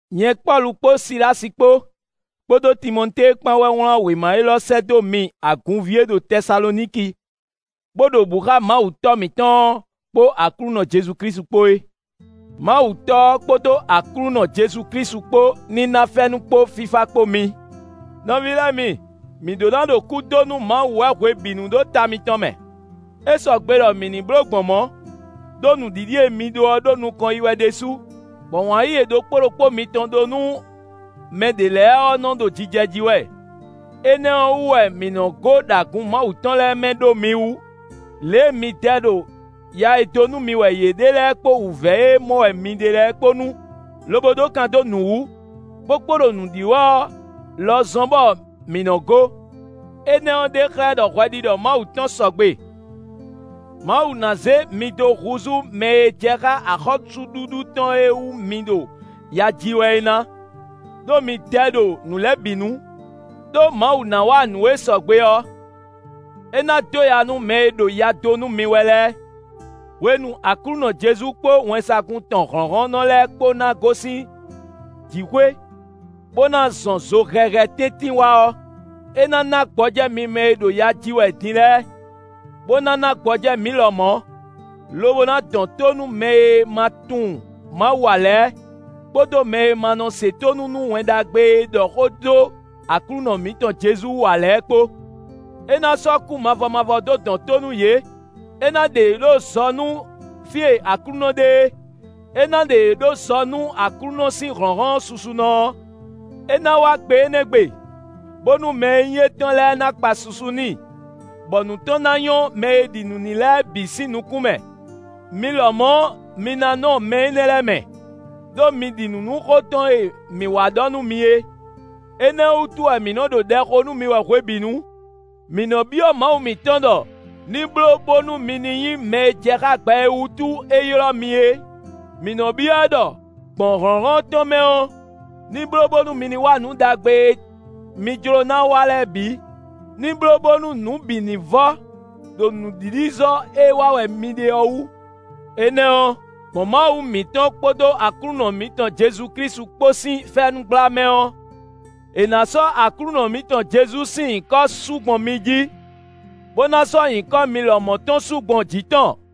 Nyɛ Pɔ́lu kpó Silási kpó, kpódó Timɔtée kpán wɛ wlán wěma élɔ́ sɛ́ dó mi agunví e ɖo Tɛsaloniki, bó ɖo bǔ xá Mawu Tɔ́ mǐtɔn ɔ́ kpó Aklúnɔ Jezu Klísu kpó é. Mawu Tɔ́ ɔ́ kpódó Aklúnɔ Jezu Klísu kpó ní ná fɛ́nú kpó fífá kpó mi. Nɔví lɛ́ɛ mi, mǐ ɖó ná ɖo kú dó nú Mawu wɛ hwebǐnu ɖó ta mitɔn mɛ. É sɔgbe ɖɔ mǐ ní bló gbɔn mɔ̌, ɖó nǔɖiɖi e mi ɖó ɔ́ ɖo nukɔn yi wɛ ɖésú, bɔ wǎn yíyí e ɖokpó ɖokpó mitɔn ɖó nú mɛ ɖě lɛ́ɛ ɔ́ nɔ ɖo jijɛ jí wɛ. Énɛ́ ɔ́ wú wɛ mǐ nɔ gó ɖo agun Mawu tɔn lɛ́ɛ mɛ ɖó mi wu; lě e mi dɛ ɖo ya e dó nú mi wɛ yě ɖe lɛ́ɛ kpó wǔvɛ́ e mɔ wɛ mi ɖe lɛ́ɛ kpó nu, lobo ɖó kan dó nǔ wú, bó kpo ɖo nǔ ɖi wɛ ɔ́ lɔ zɔ́n, bɔ mǐ nɔ́ gó. Énɛ́ ɔ́ ɖe xlɛ́ ɖɔ hwɛɖiɖɔ Mawu tɔn sɔgbe; Mawu ná zé mi dó húzú mɛ e jɛ xá axɔ́súɖuɖu tɔn e wú mi ɖo ya ji wɛ é ná, ɖó mi dɛ ɖo nǔ lɛ́ɛ bǐ nu. Đó Mawu ná wa nǔ e sɔgbe ɔ́; é ná dó ya nú mɛ e ɖo ya dó nú mi wɛ lɛ́ɛ; hwenu Aklúnɔ Jezu kpó wɛnsagun tɔn hlɔ̌nhlɔ́nnɔ lɛ́ɛ kpó ná gosín jǐxwé, bó ná zɔn zo hɛhɛ tɛ́ntin wá ɔ́, é ná ná gbɔjɛ́ mi mɛ e ɖo ya ji wɛ din lɛ́ɛ, bó ná ná gbɔjɛ́ mǐ lɔmɔ̌, lobo ná dɔn tó nú mɛ e ma tunwun Mawu ǎ lɛ́ɛ, kpódó mɛ e ma nɔ se tónú nú Wɛn Ɖagbe e ɖɔ xó dó Aklúnɔ mǐtɔn Jezu wú ǎ lɛ́ɛ kpó. É na sɔ́ kú mavɔ mavɔ dó dɔn tó nú yě; é ná ɖe yě ɖó zɔ nú fí e Aklúnɔ ɖe é; é ná ɖe yě ɖó zɔ nú Aklúnɔ sín hlɔ̌nhlɔ́n susunɔ ɔ́. É ná wá gbe énɛ́ gbe, bónú mɛ e nyí étɔn lɛ́ɛ ná kpa susu n'i, bɔ nǔ tɔn ná nyɔ́ mɛ e ɖi nǔ n'i lɛ́ɛ bǐ sín nukún mɛ; mi lɔmɔ̌ mi ná nɔ mɛ énɛ́ lɛ́ɛ mɛ, ɖó mi ɖi nǔ nú xó tɔn e mǐ wá ɖɔ nú mi é. Énɛ́ ɔ́ wútu wɛ mǐ nɔ ɖo ɖɛ xo nú mi wɛ hwebǐnu. Mǐ nɔ byɔ́ Mawu mǐtɔn ɖɔ ní bló bónú mi ní nyí mɛ e jɛ xá gbɛ e wútu é ylɔ́ mi é. Mǐ nɔ byɔ́ ɛ ɖɔ, gbɔn hlɔ̌nhlɔ́n tɔn mɛ ɔ́, ní bló bónú mi ní wa nǔ ɖagbe e mi jló ná wa lɛ́ɛ bǐ; ní bló bónú nǔ bǐ ní vɔ́ ɖo nǔɖiɖizɔ́ e wa wɛ mi ɖe ɔ́ wú. Énɛ́ ɔ́, gbɔn Mawu mǐtɔn kpódó Aklúnɔ mǐtɔn Jezu Klísu kpó sín fɛ́nú gbla mɛ ɔ́, è nǎ sɔ́ Aklúnɔ mǐtɔn Jezu sín nyǐkɔ su gbɔn mi jí, bó ná sɔ́ nyǐkɔ mi lɔmɔ̌ tɔn su gbɔn jǐ tɔn.